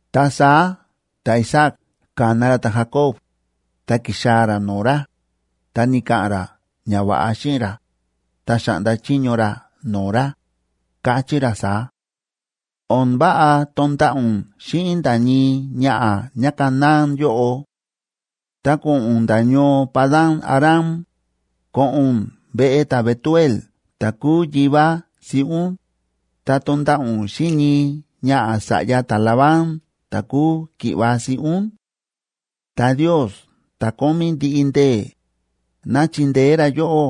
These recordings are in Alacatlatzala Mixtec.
Ta saá ta̱Isaac ka̱na ra ta̱Jacob, ta ki̱xaa̱ ra no̱o̱ ra, ta ni̱ka̱ꞌa̱n ra ñava̱ꞌa xíꞌin ra, ta xa̱ꞌnda chiño ra no̱o̱ ra, káchí ra saá: ―O̱n váꞌa tonda̱ꞌa̱ ún xíꞌin nda̱ ñii ñaꞌa̱ ñáCanaán yóꞌo. Ta ko̱ꞌo̱n ún nda̱ ñoo Padan‑aram, ko̱ꞌo̱n ún veꞌe ta̱Betuel ta̱ kúu yivá siꞌí ún, ta tonda̱ꞌa̱ ún xíꞌin ñii ñaꞌa̱ sa̱ꞌya ta̱Labán ta̱ kúu ki̱ꞌva̱ siꞌí ún. Ta Ndios ta̱ Kómí Ndiꞌi Ndee̱, ná chindeé ra yóꞌó,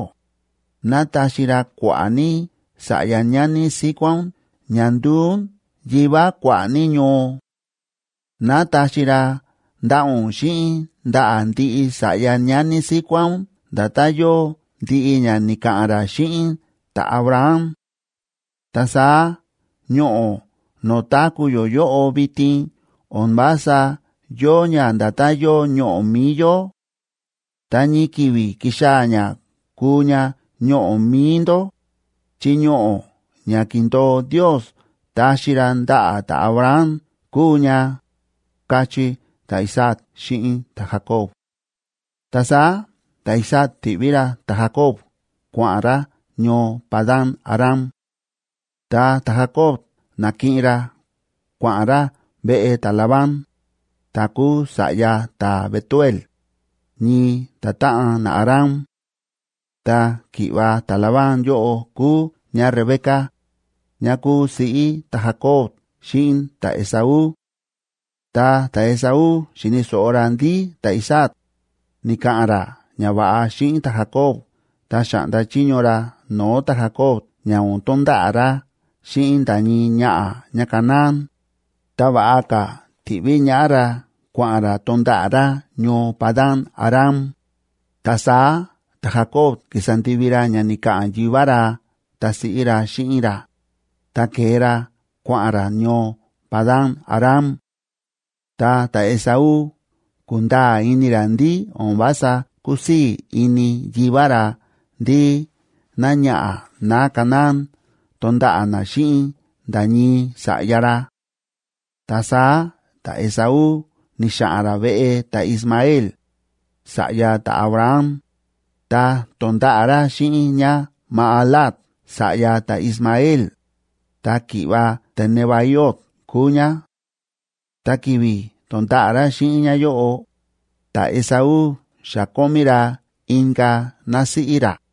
ná taxi ra kua̱ꞌa̱ ní sa̱ꞌya ñani síkuá ún ña nduu ún yivá kua̱ꞌa̱ ní ñoo. Ná taxi ra ndaꞌa̱ ún xíꞌin ndaꞌa̱ ndiꞌi sa̱ꞌya ñani síkuá ún nda̱tán yóo ndiꞌi ña ni̱ka̱ꞌa̱n ra xíꞌin ta̱Abraham. Ta saá ñoꞌo̱ no̱o̱ táku̱ yó yóꞌo vitin o̱n vása yóo ña nda̱tán yóo ñoꞌo̱ mi̱i yó. Ta ñii ki̱vi̱ kixaa̱ ña kuu ña ñoꞌo̱ mi̱i ndó, chi ñoꞌo̱ ña ki̱ndo̱o Ndios taxi ra ndaꞌa̱ ta̱Abraham kúu ña ―káchí ta̱Isaac xíꞌin ta̱Jacob. Ta saá ta̱Isaac ti̱ꞌví ra ta̱Jacob kua̱ꞌa̱n ra ñoo Padan‑aram. Ta ta̱Jacob na̱kiꞌin ra kua̱ꞌa̱n ra veꞌe ta̱Labán, ta̱ kúu sa̱ꞌya ta̱Betuel, ñii ta̱táꞌan naAram. Ta ki̱ꞌva̱ ta̱Labán yóꞌo kúu ñáRebeca, ñá kúu siꞌí ta̱Jacob xíꞌin ta̱Esaú. Ta ta̱Esaú xi̱ni̱ so̱ꞌo ra ndí ta̱Isaac ni̱ka̱ꞌa̱n ra ñava̱ꞌa xíꞌin ta̱Jacob ta xa̱ꞌnda chiño ra no̱o̱ ta̱Jacob ña o̱n tonda̱ꞌa̱ ra xíꞌin nda̱ ñii ñaꞌa̱ ñáCanaán, ta va̱ꞌa ka̱ ti̱ꞌví ñaꞌá ra kua̱ꞌa̱n ra tonda̱ꞌa̱ ra ñoo Padan‑aram, ta saá ta̱Jacob ki̱sa ndivi ra ña ni̱ka̱ꞌa̱n yivá ra ta siꞌí ra xíꞌin ra, ta ke̱e ra kua̱ꞌa̱n ra ñoo Padan‑aram. Ta ta̱Esaú ku̱nda̱a̱ ini ra ndí o̱n vása kúsii̱ ini yivá ra ndí náñaꞌa̱ náCanaán tonda̱ꞌa̱ ná xíꞌin nda̱ ñii sa̱ꞌya ra. Ta saá ta̱Esaú ni̱xa̱ꞌa̱n ra veꞌe ta̱Ismael, sa̱ꞌya ta̱Abraham, ta to̱nda̱ꞌa̱ ra xíꞌin ñáMahalat sa̱ꞌya ta̱Ismael, ta ki̱ꞌva̱ ta̱Nebaiot kúu ñá. Ta ki̱vi̱ to̱nda̱ꞌa̱ ra xíꞌin ñáyóꞌo, ta̱Esaú xa kómí ra inka̱ násíꞌí ra.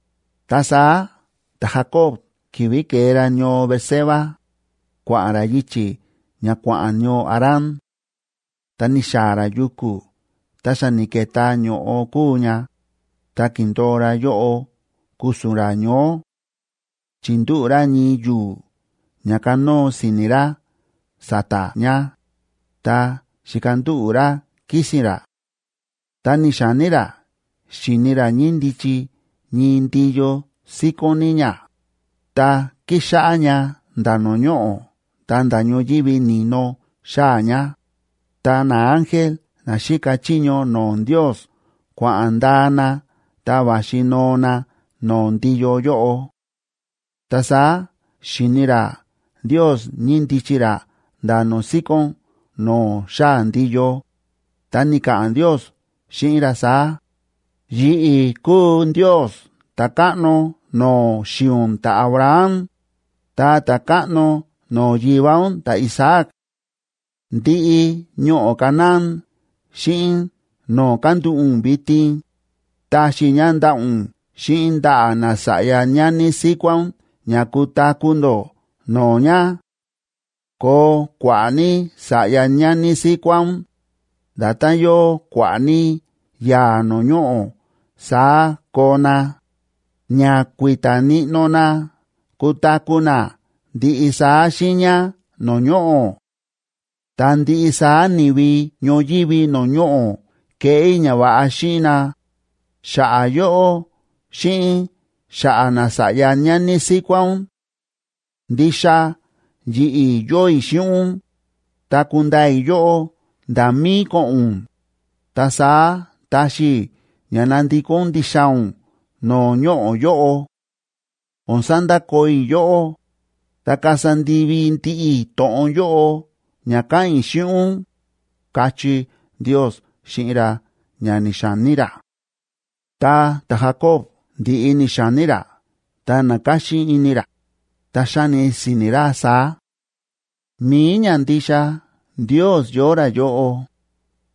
Ta saá ta̱Jacob ki̱vi̱ ke̱e ra ñoo Beerseba, kua̱ꞌa̱n ra yichi̱ ña kua̱ꞌa̱n ñoo Harán. Ta ni̱xaa̱ ra yuku̱ ta xa ni̱ke̱tá ño̱ꞌo kúu ña, ta ki̱ndo̱o ra yóꞌo ku̱su̱n ra ñoó. Chi̱ndúꞌu̱ ra ñii yu̱u̱ ña kanóo si̱ni̱ ra sa̱ta̱ ña, ta xi̱kandúꞌu̱ ra kísi̱n ra. Ta ni̱xa̱ní ra xi̱ni ra ñíndichi ñii ndiyo síkón ní ña, ta kíxáꞌá ña nda̱ no̱o̱ ñoꞌo̱ ta̱nda̱ ñoyívi ni̱no xáa̱ ña, ta naángel na xíka chiño no̱o̱ Ndios kua̱ꞌa̱n ndaa na ta va̱xi noo na no̱o̱ ndiyo yóꞌo. Ta saá xi̱ni ra Ndiosa ñíndichi ra nda̱ no̱o̱ síkón no̱o̱ xáa̱ ndiyo, ta ni̱ka̱ꞌa̱n Ndios xíꞌin ra saá: Yi̱ꞌi̱ kúu Ndios ta̱káꞌno no̱o̱ xi̱i̱ ún ta̱Abraham ta ta̱káꞌno no̱o̱ yivá ún ta̱Isaac. Ndiꞌi ñoꞌo̱ Canaán xíꞌin no̱o̱ kándúꞌu̱ ún vitin, taxi i̱ ña ndaꞌa̱ ún xíꞌin ndaꞌa̱ nasa̱ꞌya ñani síkuá ún ña kutaku̱ ndó no̱o̱ ña. Koo kua̱ꞌa̱ ní sa̱ꞌya ñani síkuá ún, nda̱tán yóo kua̱ꞌa̱ ní yaa̱ no̱o̱ ñoꞌo̱ saá koo na, ña kui̱ta̱ níꞌnó na kutaku̱ na ndiꞌi saá xiiña no̱o̱ ñoꞌo̱. Ta ndiꞌi saá ni̱vi ñoyívi no̱o̱ ñoꞌo̱ keꞌé i̱ ñava̱ꞌa xíꞌin na, xa̱ꞌa̱ yóꞌó xíꞌin xa̱ꞌa̱ nasa̱ꞌya ñani síkuá ún. Ndixa yi̱ꞌi̱ yóo i̱ xíꞌin ún, ta kundaa i̱ yóꞌó nda̱ mí ko̱ꞌo̱n ún, ta saá taxi i̱ ña nandikó ún ndixaa̱ ún no̱o̱ ñoꞌo̱ yóꞌo. O̱n sandakoo i̱ yóꞌó, ta kasa ndivi ndiꞌi i̱ to̱ꞌon yóꞌo ña káꞌa̱n i̱ xíꞌin ún, káchí Ndios xíꞌin ra ña ni̱xa̱ní ra. Ta ta̱Jacob ndi̱ꞌi ni̱xa̱ní ra ta na̱káxín ini ra, ta xa̱ni si̱ni̱ ra saá: “Mi̱i ñandixa Ndios yóo ra yóꞌo,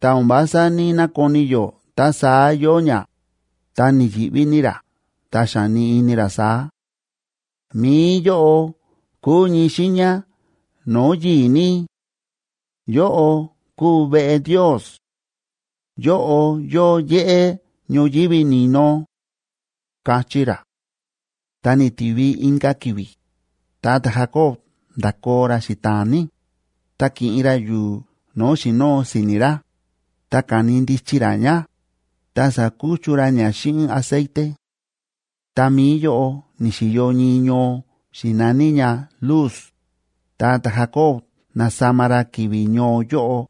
ta o̱n vása ní‑nakoni yó ta saá yóo ña.” Ta ni̱yi̱ꞌví ní ra ta xa̱ni ini ra saá: “Mi̱i yóꞌo kúu ñii xiiña no̱o̱ yi̱i̱ ní. ¡Yóꞌo kúu veꞌe Ndios! ¡Yóꞌo yóo yéꞌé ñoyívi ni̱no!”, káchí ra. Ta ni̱ti̱vi inka̱ ki̱vi̱, ta ta̱Jacob nda̱koo ra xita̱a̱n ní, ta ki̱ꞌin ra yu̱u̱ no̱o̱ xi̱nóo si̱ni̱ ra, ta ka̱ni ndichi ra ña, ta sa̱kuchu ra ña xíꞌin aceite. Ta mi̱i yóꞌo ni̱xi̱yo ñii ñoo xi̱naní ña Luz, ta ta̱Jacob na̱sama ra ki̱vi̱ ñoo yóꞌo,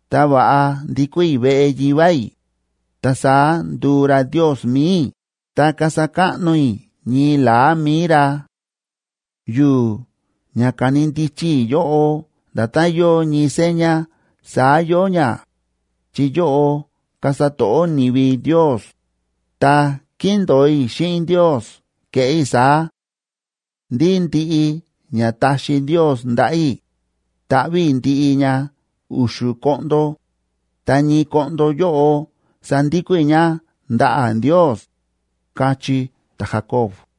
ta va̱ꞌa ndikó i̱ veꞌe yivá i̱, ta saá nduu ra Ndios mi̱i i̱ ta kasa káꞌno i̱ ñii la̱á mi̱i ra. Yu̱u̱ ña ka̱ni ndichi i̱ yóꞌo nda̱tán yóo ñii seña saá yóo ña, chi yóꞌo kasa to̱ꞌó ni̱vi Ndios; ta kíndo̱o i̱ xíꞌin Ndios keꞌé i̱ saá: ndí ndiꞌi ña taxi Ndios ndaꞌa̱ i̱, taꞌví i̱ ndiꞌi ña u̱xu̱ koꞌndo, ta ñii koꞌndo yóꞌo sandikó i̱ ña ndaꞌa̱ Ndios, káchí ta̱Jacob.